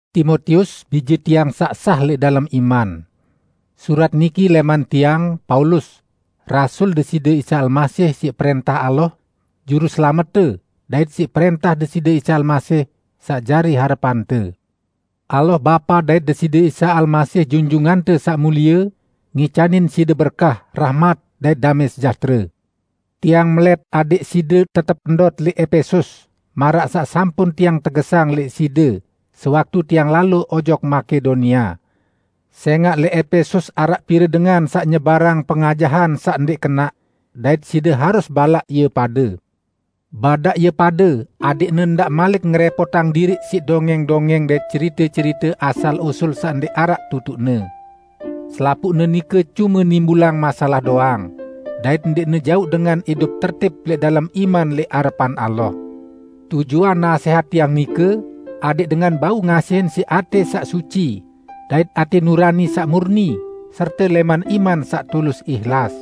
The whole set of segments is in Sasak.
Timotius, bije tiang saq sah lẽq dalem iman! Surat niki lẽman tiang, Paulus, rasul Deside Isa Almasih siq prẽntah Allah, Juruselamette dait siq prẽntah Deside Isa Almasih, saq jari harepante. Allah Bapa dait Deside Isa Almasih Junjungante Saq Mulie ngicanin side berkah, rahmat dait damẽ sejahtere. Tiang melẽt adẽq side tetep ndot lẽq Epesus maraq saq sampun tiang tegesang lẽq side sewaktu tiang lalo ojok Makedonia. Sẽngaq, lẽq Epesus araq pire dengan saq nyebarang pengajahan saq ndẽq kenaq, dait side harus balaq ie pade. Badaq ie pade adẽqne ndaq malik ngerẽpotang diriq siq dongẽng-dongẽng dait cerite-cerite asal-usul saq ndẽq araq tutuqne. Selapuqne nike cume nimbulang masalah doang, dait ndẽqne jauq dengan idup tertib lẽq dalem iman lẽq arepan Allah. Tujuan nasẽhat tiang nike adẽq dengan bau ngasihin siq atẽ saq suci, dait atẽ nurani saq murni serte lẽman iman saq tulus ihlas.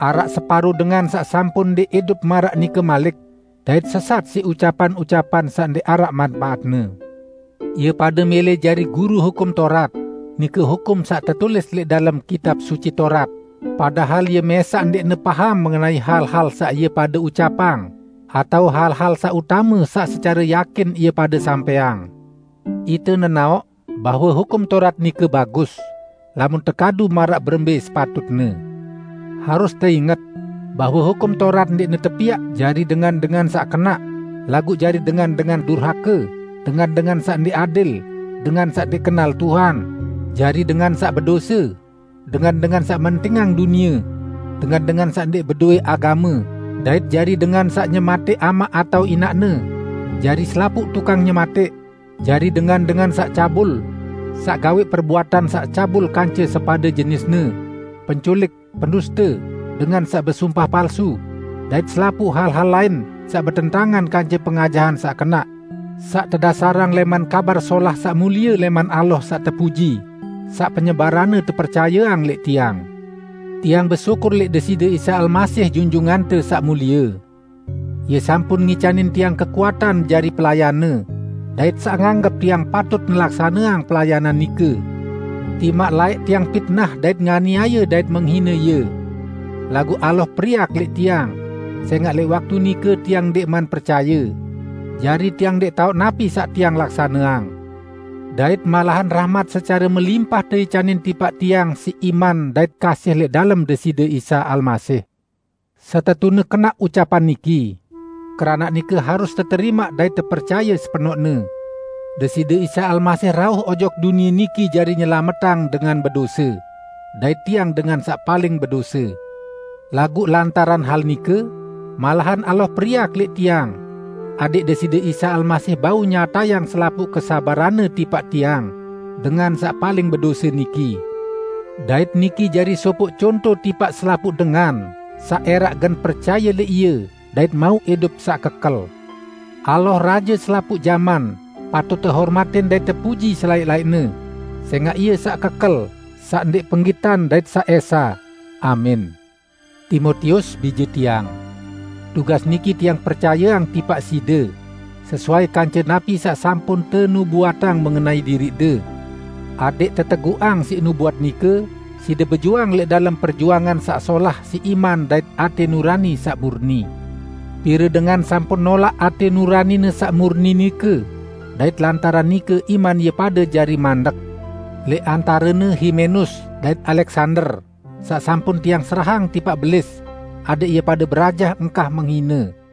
Araq separo dengan saq sampun ndẽq idup maraq nike malik, dait sesat siq ucapan-ucapan saq ndẽq araq manpaatne. Ie pade mẽlẽ jari guru Hukum Taurat, nike hukum saq tetulis lẽq dalem Kitab Suci Taurat, padahal ie mẽsaq ndẽqne paham mengenai hal-hal saq ie pade ucapang atao hal-hal saq utame saq secare yakin ie pade sampẽang. Ite nenaoq bahwe Hukum Taurat nike bagus, lamun tekadu maraq berembẽ sepatutne. Harus teinget bahwe Hukum Taurat ndẽqne tepiaq jari dengan-dengan saq kenaq, laguq jari dengan-dengan durhake, dengan-dengan saq ndẽq adil, dengan saq ndẽq kenal Tuhan, jari dengan saq bedose, dengan-dengan saq mentingang dunie, dengan-dengan saq ndẽq bedowẽ agame, dait jari dengan saq nyematẽq amaq atao inaqne, jari selapuq tukang nyematẽq, jari dengan-dengan saq cabul, saq gawẽq perbuatan saq cabul kance sepade jenisne, penculik, penduste, dengan saq besumpah palsu, dait selapuq hal-hal lain saq betentangan kance pengajahan saq kenaq, saq tedasarang lẽman Kabar Solah saq mulie lẽman Allah Saq Tepuji, saq penyebaranne tepercayeang lẽq tiang. Tiang besyukur lẽq Deside Isa Almasih Junjungante Saq Mulie. Ie sampun ngicanin tiang kekuatan jari pelayan-Ne, dait saq nganggep tiang patut ngelaksaneang pelayanan nike, timaq laẽq tiang pitnah dait nganiaye dait menghine Ie. Laguq Allah periak lẽq tiang, sẽngaq lẽq waktu nike tiang ndẽqman percaye, jari tiang ndẽq taoq napi saq tiang laksaneang. Dait malahan rahmat secare melimpah teicanin tipaq tiang siq iman dait kasih lẽq dalem Deside Isa Almasih. Setetune kenaq ucapan niki -- keranaq nike harus teterimaq dait tepercaye sepenoqne --: "Deside Isa Almasih rauh ojok dunie niki jari nyelametang dengan bedose." Dait tiang dengan saq paling bedose. Laguq lantaran hal nike malahan Allah periak lẽq tiang, adẽq Deside Isa Almasih bau nyatayang selapuq kesabaran-Ne tipaq tiang, dengan saq paling bedose niki. Dait niki jari sopoq conto tipaq selapuq dengan saq ẽraq gen percaye lẽq Ie dait mauq idup saq kekel. Allah, Raje selapuq jaman, patut tehormatin dait tepuji selaẽq-laẽqne, sẽngaq Ie saq kekel, saq ndẽq penggitan dait saq Esa! Amin. Timotius, bije tiang! Tugas niki tiang percayeang tipaq side sesuai kance napi saq sampun tenubuatang mengenai diriqde, adẽq teteguqang siq nubuat nike side bejuang lẽq dalem perjuangan saq solah siq iman dait atẽ nurani saq murni. Pire dengan sampun nolaq atẽ nuranine saq murni nike, dait lantaran nike iman ie pade jari mandek, lẽq antarene Himenus dait Aleksander, saq sampun tiang serahang tipaq Belis adẽq ie pade berajah engkah menghine.